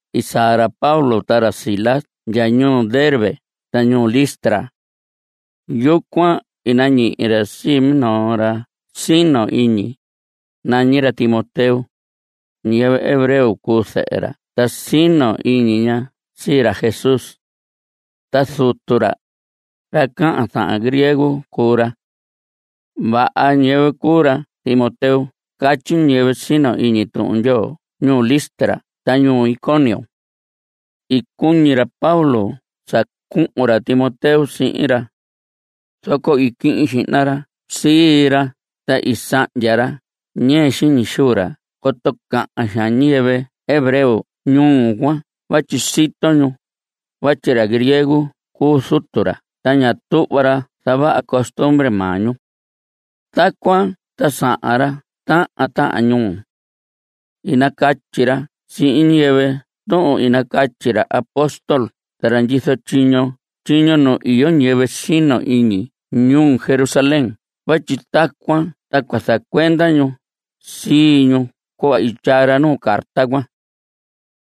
I saa ra Pablo ta ra Silas ndya ñuu Derbe ta ñuu Listra. Yucuan i nañihi ra sii minoo ra sino iñi. Nañi ra Timoteo. Ñiyɨvɨ hebreo cuu zɨhɨ ra ta sino iñi ña sii ra Jesús. Ta zutu ra, ra cahan zahan griego cuu ra. Vaha ñiyɨvɨ cuu ra Timoteo catyi ñiyɨvɨ sino iñi Tuhun Ndyoo ñuu Listra ta ñuu Iconio. I cuñi ra Pablo sa cuhun ra Timoteo sihin ra. Zoco i quihin xihna ra sii ra ta i sahndya ra ñɨɨ xiñi xuu ra coto cahan xaan ñiyɨvɨ hebreo ñuu cuan vatyi sito ñu vatyi ra griego cuu zutu ra ta ña tuhva ra zavaha costumbre maa ñu. Tacuan ta sahan ra tahan tahan ñuu. I nacatyi ra sihin ñiyɨvɨ tuhun i nacatyi ra apóstol ta ra ndyizo tyiño nu iyo ñiyɨvɨ sino iñi ñuu Jerusalén vatyi tacuan ta cua zacuenda ñu sii ñu cuhva i tyaa ra nuu carta cuan.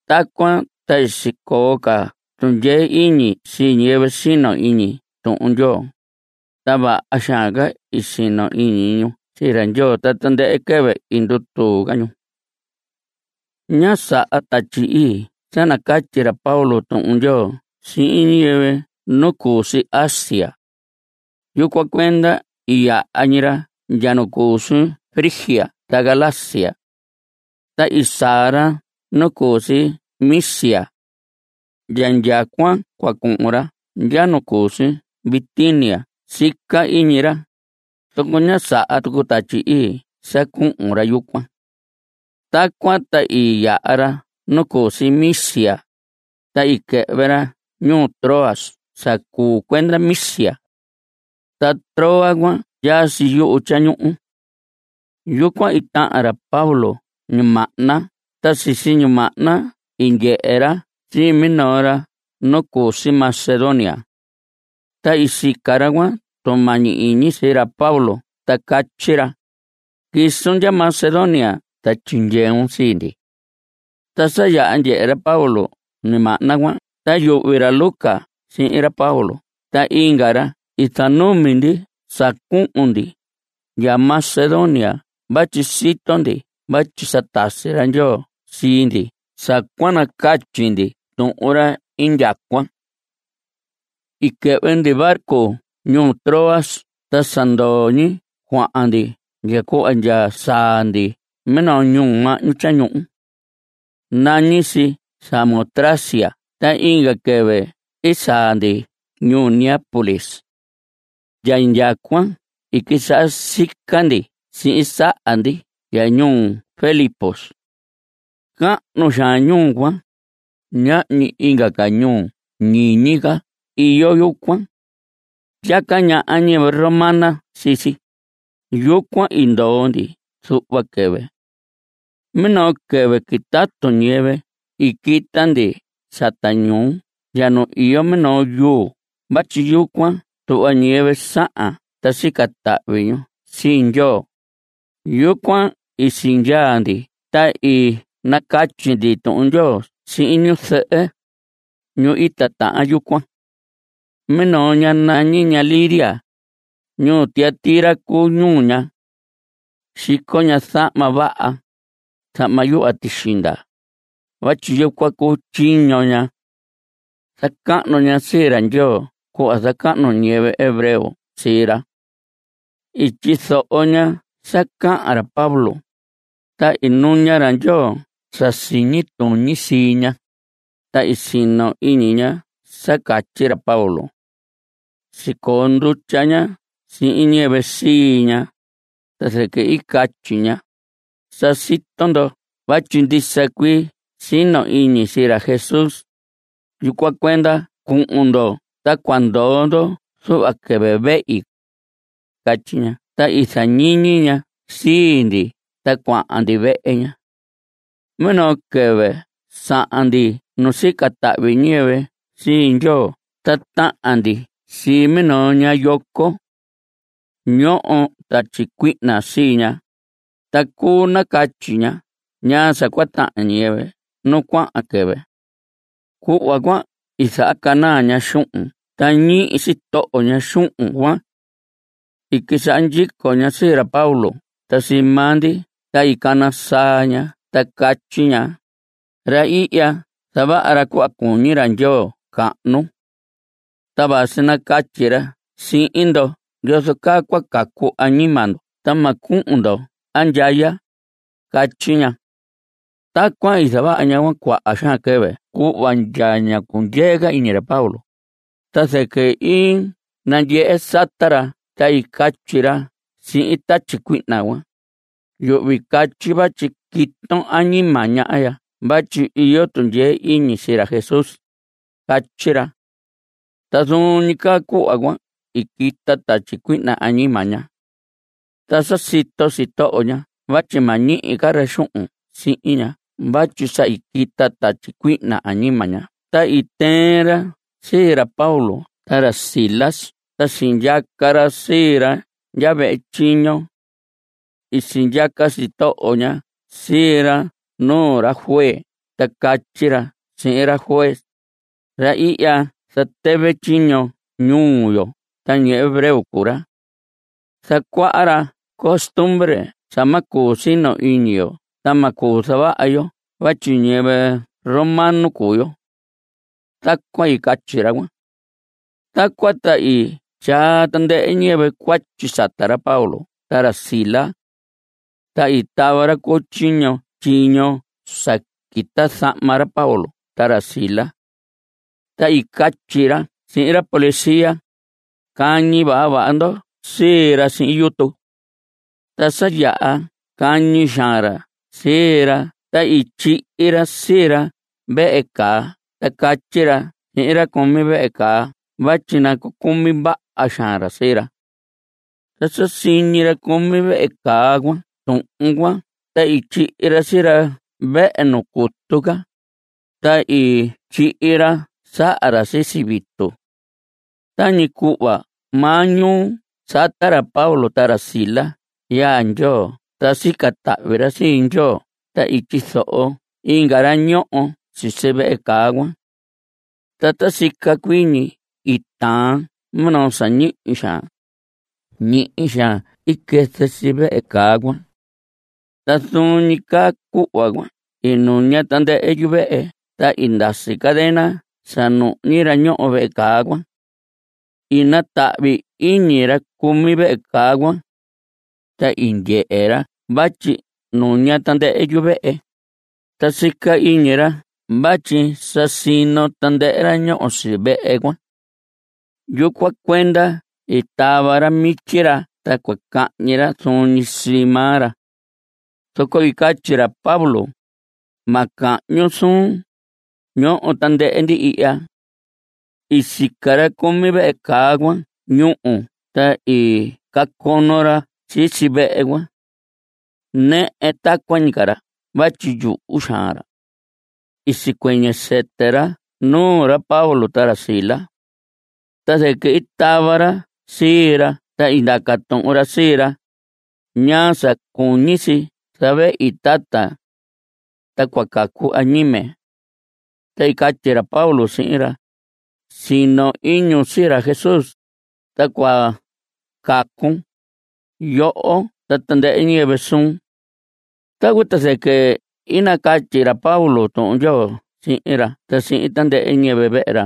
Tacuan ta sicoo ca tundyee iñi sii ñiyɨvɨ sino iñi Tuhun Ndyoo, ta vaha xaan ca sino iñi ñu sii ra Ndyoo ta tandɨhɨ quɨvɨ i ndutuu ca ñu. Ñá saha Tatyi Ii sa nacatyi ra Pablo Tuhun Ndyoo sihin ñiyɨvɨ nu cu si Asia. Yucuan cuenda i yaha ñi ra ndya nu cu si Frigia ta Galacia. Ta i saa ra nu cu si Misia. Ndya indyacuan cua cuhun ra ndya nu cu si Bitinia sica iñi ra, zoco ñá saha tucu Tatyi Ii sa cuhun ra yucuan. Tacuan ta i yaha ra nu cu si Misia, ta i quɨhvɨ ra ñuu Troas sa cuu cuenda Misia. Ta Troas cuan ndyaa si yuhu tyañuhu. Yucuan i tahan ra Pablo ñimahna ta sisi ñimahna i ndyehe ra sii minoo ra nu cu si Macedonia. Ta i sica ra cuan tumañi iñi sii ra Pablo ta catyi ra: “Quisun ndya Macedonia ta tyindyeun sii ndi.” Ta sa yaha ndyehe ra Pablo ñimahna cuan ta yuhvi ra Lucas sihin ra Pablo ta inga ra i zanumi ndi sa cuhun ndi ndya Macedonia vatyi sito ndi vatyi sa tasi ra Ndyoo sii ndi sa cua nacatyi ndi tuhun ra indyacuan. I quɨhvɨ ndi barco ñuu Troas ta sa ndoo ñi cuahan ndi ndya cuhva ndya saa ndi minoo ñuhu mahñu tyañuhu. Nañi si Samotracia ta inga quɨvɨ i saa ndi ñuu Neápolis. Ndya indyacuan i quisaha sica ndi sihin saha ndi ndya ñuu Filipos. Cahnu xaan ñuu cuan. Ñahñi inga ca ñuu ñiñi ca iyo yucuan. Ndyaca ñaha ñiyɨvɨ romana sii si. Yucuan i ndoo ndi zuhva quɨvɨ. Minoo quɨvɨ quitatu ñiyɨvɨ i quita ndi sata ñuu ndya nu iyo minoo yuu vatyi yucuan tuhva ñiyɨvɨ sahan ta sica tahvi ñu sii Ndyoo. Yucuan i sindyaa ndi ta i nacatyi ndi Tuhun Ndyoo sihin ñu zɨhɨ, ñu i titahan yucuan. Minoo ña nañi ña Lidia. Ñuu Tiatira cuu ñuu ña. Xico ña zahma vaha, zahma yuhva tixinda, vatyi yucuan cuu tyiño ña. Zacahnu ña sii ra Ndyoo cuhva zacahnu ñiyɨvɨ hebreo sii ra. I tyizoho ña sa cahan ra Pablo, ta i nuña ra Ndyoo sa siñi tuñi sii ña, ta i sino iñi ña sa catyi ra Pablo. Sicoo ndutya ña sihin ñiyɨvɨ sii ña, ta zɨquɨ i catyi ña: Sa sito ndo vatyi ndisa cuii sino iñi sii ra Jesús, yucuan cuenda cuhun ndo ta cua ndoo ndo zuhva quɨvɨ vehi. Catyi ña ta i zañiñi ña sii ndi ta cuahan ndi vehe ña. Minoo quɨvɨ sahan ndi nu sica tahvi ñiyɨvɨ sii Ndyoo ta tahan ndi sii minoo ña yoco. Ñoho tatyi cuihna sii ña, ta cuu nacatyi ña ñaa sa cua tahan ñiyɨvɨ nu cuahan quɨvɨ. Cuhva cuan i zahacanaa ña xuhun ta ñihi sitoho ña xuhun cuan. I quisaha ndyico ña sii ra Pablo ta sii maa ndi ta i cana saa ña ta catyi ña: Ra ihya zavaha ra cuhva cuñi ra Ndyoo cahnu. Ta vasi nacatyi ra sihin ndo yozo caa cua cacu añima ndo ta ma cuhun ndo andyaya. Catyi ña. Tacuan i zavaha ña cuaha xaan quɨvɨ cuhva ndya ñá cundyee ca iñi ra Pablo, ta zɨquɨ i nandyehe sata ra ta i catyi ra sihin tatyi cuihna cuan: Yuhvi catyi vatyi quiton añima ña ya vatyi iyo tundyee iñi sii ra Jesús. Catyi ra. Ta zuun ñi caa cuhva cuan i quita tatyi cuihna añima ña. Ta sa sito sitoho ña vatyi ma ñihi ca ra xuhun sihin ña vatyi sa i quita tatyi cuihna añima ña ta i tɨɨn ra sii ra Pablo ta ra Silas ta sindyaca ra sii ra ndya vehe tyiño. I sindyaca sitoho ña sii ra nuu ra juez ta catyi ra sihin ra juez: Ra ihya zatɨvɨ tyiño ñuu yo ta ñiyɨvɨ hebreo cuu ra. Zacuaha ra costumbre sa ma cuu sino iñi yo ta ma cuu zavaha yo vatyi ñiyɨvɨ romano cuu yo. Tacuan i catyi ra cuan. Tacuan ta i tyaa tandɨhɨ ñiyɨvɨ cuatyi sata ra Pablo ta ra Silas. Ta i tava ra cu tyiño tyiño sa quita zahma ra Pablo ta ra Silas. Ta i catyi ra sihin ra policía: Cañi vaha vaha ndo sii ra sihin yutu. Ta sa yaha cañi xaan ra sii ra ta i tyihi ra sii ra vehe caa ta catyi ra sihin ra cumi vehe caa vatyi nacucumi vaha xaan ra sii ra. Ta sa ñihi ra cumi vehe caa cuan tuhun cuan ta i tyihi ra sii ra vehe nu cutu ca, ta i tyihi ra saha ra sisi vitu. Tañi cuhva maa ñuu sata ra Pablo ta ra Silas yaa Ndyoo ta sica tahvi ra sii Ndyoo ta i tyizoho inga ra ñoho si vehe caa cuan. Ta ta sica cuii ñi i taan minoo sa ñihi xaan. Ñihi xaan i quɨzɨ si vehe caa cuan. Ta zuun ñi caa cuhva cuan i nuña tandɨhɨ yuvehe ta i ndasi cadena sa nuhñi ra ñoho vehe caa cuan. I natahvi iñi ra cumi vehe caa cuan. Ta ndyehe ra vatyi nuña tandɨhɨ yuvehe, ta sica iñi ra vatyi sa sino tandɨhɨ ra ñoho si vehe cuan. Yucuan cuenda i tava ra mityi ra ta cua cahñi ra zuun ñi sii maa ra. Zoco i catyi ra Pablo: Ma cahñun suun. Ñoho tandɨhɨ ndi ihya. I sica ra cumi vehe caa cuan ñúhu ta i cacono ra sisi vehe cuan. Nɨhɨ tacuan ñi ca ra vatyi yuhu xaan ra. I sicuɨñɨ sɨtɨ ra nuu ra Pablo ta ra Silas. Ta zɨquɨ i tava ra sii ra ta i ndaca tuhun ra sii ra: ¿Ñaa sa cuñi si zavehi, tata, ta cua cacu añime? Ta i catyi ra Pablo sihin ra: Sino iñun sii ra Jesús, ta cua cacun, yoho ta tandɨhɨ ñiyɨvɨ suun. Tacuan ta zɨquɨ i nacatyi ra Pablo Tuhun Ndyoo sihin ra ta sihin tandɨhɨ ñiyɨvɨ vehe ra.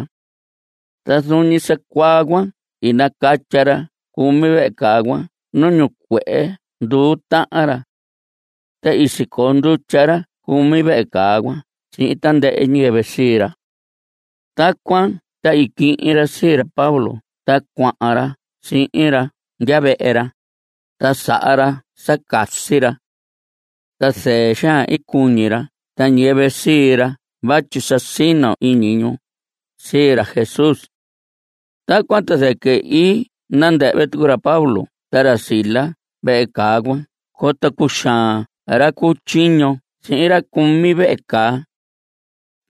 Ta zuun ñi sa cuaa cuan i nacatya ra cumi vehe caa cuan nu ñicuehe nduu tahan ra. Ta i sicoo ndutya ra cumi vehe caa cuan sihin tandɨhɨ ñiyɨvɨ sii ra. Tacuan ta i quihin ra sii ra Pablo ta cuahan ra sihin ra ndya vehe ra, ta saha ra sa casi ra. Ta zɨɨ xaan i cuñi ra ta ñiyɨvɨ sii ra vatyi sa sino iñi ñu sii ra Jesús. (Tacuan ta zɨquɨ i nandɨhvɨ tucu ra Pablo ta ra Silas vehe caa cuan coto cuxaan ra cu tyiño sihin ra cumi vehe caa.)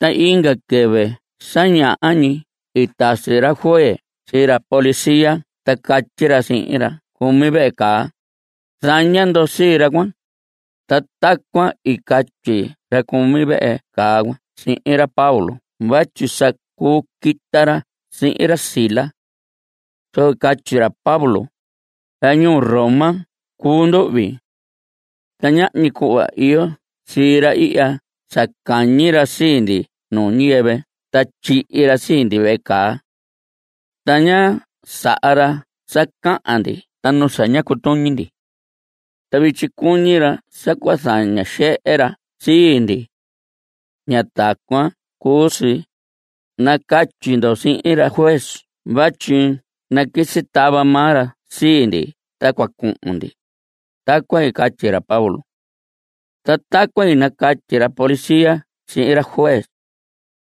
Ta inga quɨvɨ sa ñaha ñi i tasi ra juez sii ra policía ta catyi ra sihin ra cumi vehe caa: Zaña ndo sii ra cuan. Ta tacuan i catyi ra cumi vehe caa cuan sihin ra Pablo vatyi sa cuu quita ra sihin ra Silas. Zoco i catyi ra Pablo: Ra ñuu Roma cuu nduhvi. Ta ñahñi cuhva iyo sii ra ihya sa cañi ra sii ndi nuu ñiyɨvɨ ta tyihi ra sii ndi vehe caa. Ta ñá saha ra sa cahan ndi ta nu sa ñá cutuñi ndi. Ta vityi cuñi ra sa cua zaña xehe ra sii ndi. Ña tacuan cuu si. Nacatyi ndo sihin ra juez vatyi naquisi tava maa ra sii ndi ta cua cuhun ndi. Tacuan i catyi ra Pablo. Ta tacuan i nacatyi ra policía sihin ra juez.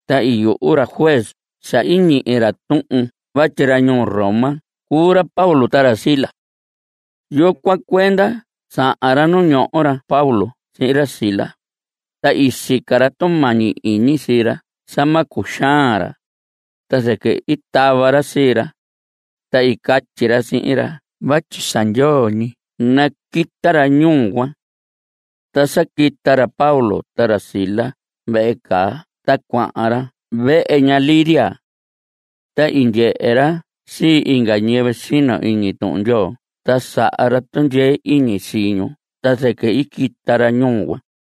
Ta i yuhu ra juez sa ñihi ra tuhun vatyi ra ñuu Roma cuu ra Pablo ta ra Silas. Yucuan cuenda sahan ra nu ñoho ra Pablo sihin ra Silas ta i sica ra tumañi iñi sii ra sa ma cuxaan ra, ta zɨquɨ i tava ra sii ra, ta i catyi ra sihin ra vatyi sa ndyoo ñi naquita ra ñuu cuan. Ta sa quita ra Pablo ta ra Silas vehe caa ta cuahan ra vehe ña Lidia. Ta i ndyehe ra sii inga ñiyɨvɨ sino iñi Tuhun Ndyoo ta saha ra tundyee iñi sii ñu ta zɨquɨ i quita ra ñuu cuan.